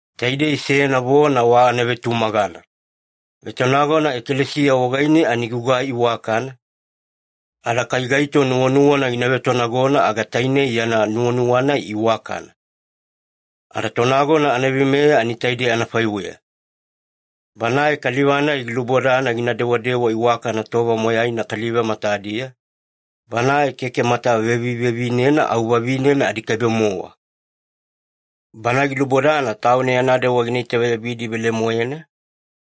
Taidei seyana vona wa anavetumagana. Vetonagona ekalesiya wagaine ani gugai iwakana, ada kai gaito nuwanuwana gina vetonagona aga tainei yana nuwanuwa-nai iwakana. Ada tonagona anaveimeya ani taidei anafaiweya. Banae kaliva-nai gilubodana gina dewadewa iwakana tova moyaina kaliva matadiya, banae keke mata vevivevinena au vavinena adikaibe-mowa. Bana gilubodana tauna yana dewa gina itaveyabidi velemoena,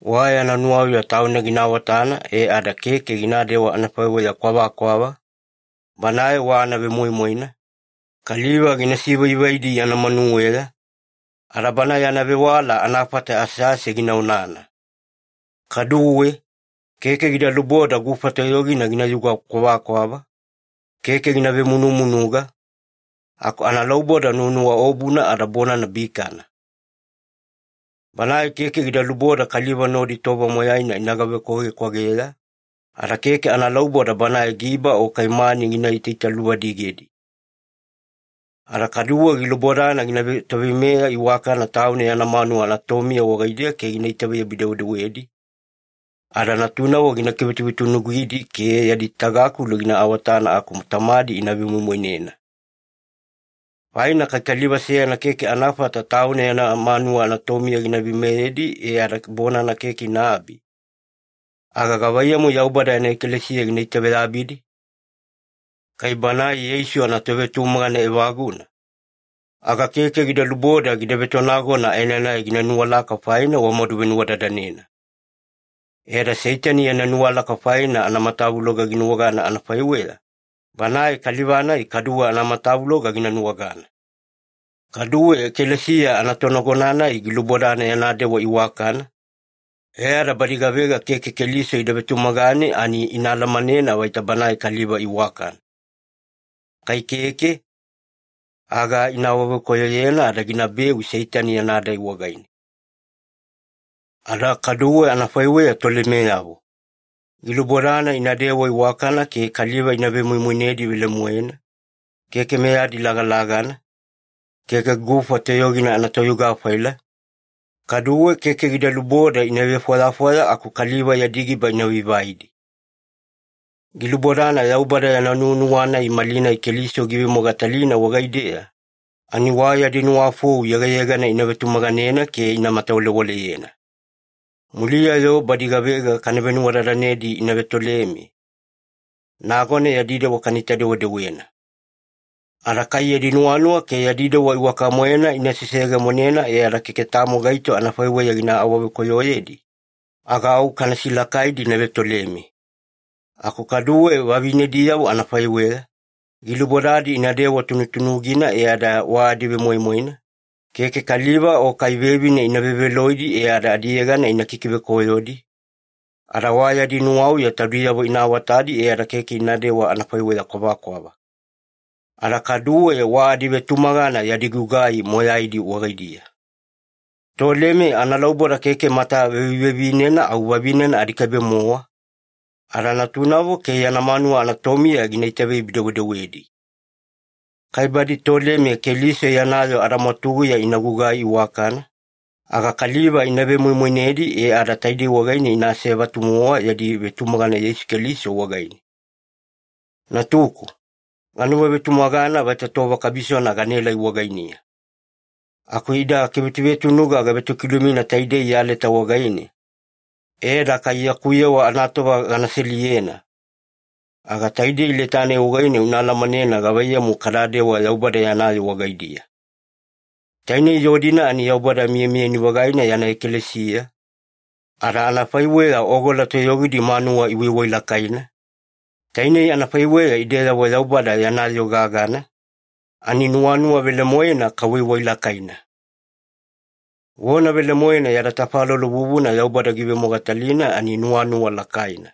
wa yana nuwauya tauna gina awatana e ada keke ginadewa anafaiweya kwavakwava, banae wa anavemoimoina, kaliva gina sivaivaidi yana manuweya, ada bana yana vewala anafata asease gina onana. Kaduwe, keke gida luboda gufa toyogina ginayuga kwavakwava, keke gina vemunumunuga, aku analauboda nuwanuwaobuna ada bonana bikana. Banae keke gida luboda kaliva nodi tova moyaina ina gavekwavekwageya, ada keke analauboda banae giba o kai mani gina itaitaluvadigedi. Ada kaduwe gilubodana gina vetoveimeya iwakana tauna yana manuwa anatomiya wagaidiya ke gina itaveyabi-dewedewedi, ada natunavo gina kivetunutunugidi ke yadi tagakulu gina awatana aku tamadi ina vemoimoinena. Faina kai kaliva seyana keke anafata tauna yana manuwa anatomiya gina veimeyedi e ada bonana keke inaabi, aga gavaiyamu Yaubada yana ekalesiya gina itaveyabidi? Kai banae Yeisu anatovetumagana evaguna, aga keke gida luboda gida vetonagona aenanai gina nuwalaka faina wamadu venuwadadanena. E ada Seitani yana nuwalaka faina anamatavuloga ginuwagana anafaiweya, banae kaliva-nai kaduwe anamatavuloga gina nuwagana. Kaduwe ekalesiya anatonagona-nai gilubodana yana dewa iwakana, e ada badi gavega keke Keliso ida vetumagane ani ina alamanena vaita banae kaliva iwakana. Kai keke, aga ina awavekoyoyena ada ginabeu Seitani yana dai wagaine. Ada kaduwe anafaiweya tolemeyavo. Gilubodana inadewa iwakana ke kaliva ina vemoimoinedi velemoena, keke meyadi lagalagana, keke gufa toyogina anatoyuga-faila, kaduwe keke gida luboda ina vefwayafwaya aku kaliva yadi giba ina vaivaidi. Gilubodana Yaubada yana nuwanuwa-nai malinai Keliso giivemogatalina wagaideya, ani wa yadi nuwafou yegayegana ina vetumaganena ke ina matawalewaleyena. Muliya-yo badi gavega kana venuwadadanedi ina vetoleme, nagona yadi dewa kanaita-dewedewena. Ada kai yadi nuwanuwa ke yadi dewa iwaka-moena ina seseyegemonena e ada keke tamo gaito anafaiweya gina awavekoyoyedi, aga au kana silakaidi ina vetoleme. Aku kaduwe vavinediyavo anafaiweya, gilubodadi inadewa tunutunugina e ada wa adivemoimoina, keke kaliva o kai vevine ina veveloidi e ada adiyegana ina kikivekoyodi, ada wa yadi nuwauya taudiyavo ina awatadi e ada keke inadewa anafaiweya kwavakwava. Ada kaduwe wa adivetumagana yadi gugai moyaidi wagaidiya. Toleme analauboda keke mata vevivevinena au vavinena adikaibe-mowa, ada natunavo ke yana manuwa anatomiya gina itaveyabi-dewedewedi. Kai badi toleme Keliso yana yoo adamwatuguya ina gugai iwakana, aga kaliva ina vemoimoinedi e ada taidei wagaine ina asevatu-mowa yadi vetumagana Yeisu Keliso wagaine. Natuku, ganuwavetumagana vaita tova kabisona ganaelai wagainiya. Aku ida kivetunutunuga gavetokilumina taidei ya leta wagaine e ada kai yaku yewa anatova gana seliyena, aga taidei leta-nai wagaine una alamanena gavaiyamu kadadewa Yaubada yana yoo wagaidiya. Tainei yoo-dina ani Yaubada miyamiyani-vagaina yana ekalesiya, ada anafaiweya ogola toyogidi manuwa iwaiwailakaina, tainei anafaiweya ideyavo Yaubada yana yoo gagana ani nuwanuwa velemoena kawaiwailakaina. Vona velemoena yada tafalolo vuvuna Yaubada givemogatalina ani nuwanuwa lakaina.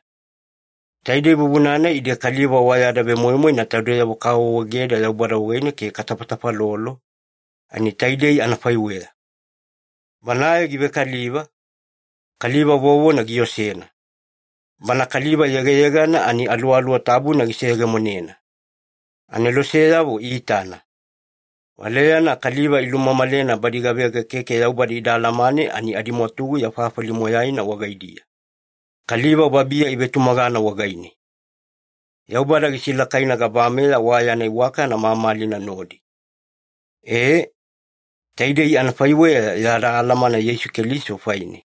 Taidei vuvuna-nai ide kaliva wa yada vemoimoina taudeyavo kaawaawaegeda Yaubada wagaine ke katafatafalolo, ani taidei anafaiweya. Banae givekaliva, kaliva vovona giosena. Bana kaliva yegayegana ani Aluwaluwa Tabuna giseyegemonena. Aneloseyavo iitana. Valeyana kaliva ilumamalena badi gavega keke Yaubada ida alamane ani adimwatuguya fafali moyaina wagaidiya. Kaliva babiya ivetumagana wagaine. Yaubada gisilakaina gabameya wa yana iwakana mamalina nodi. E, taidei anafaiweya yada alamana Yeisu Keliso faine.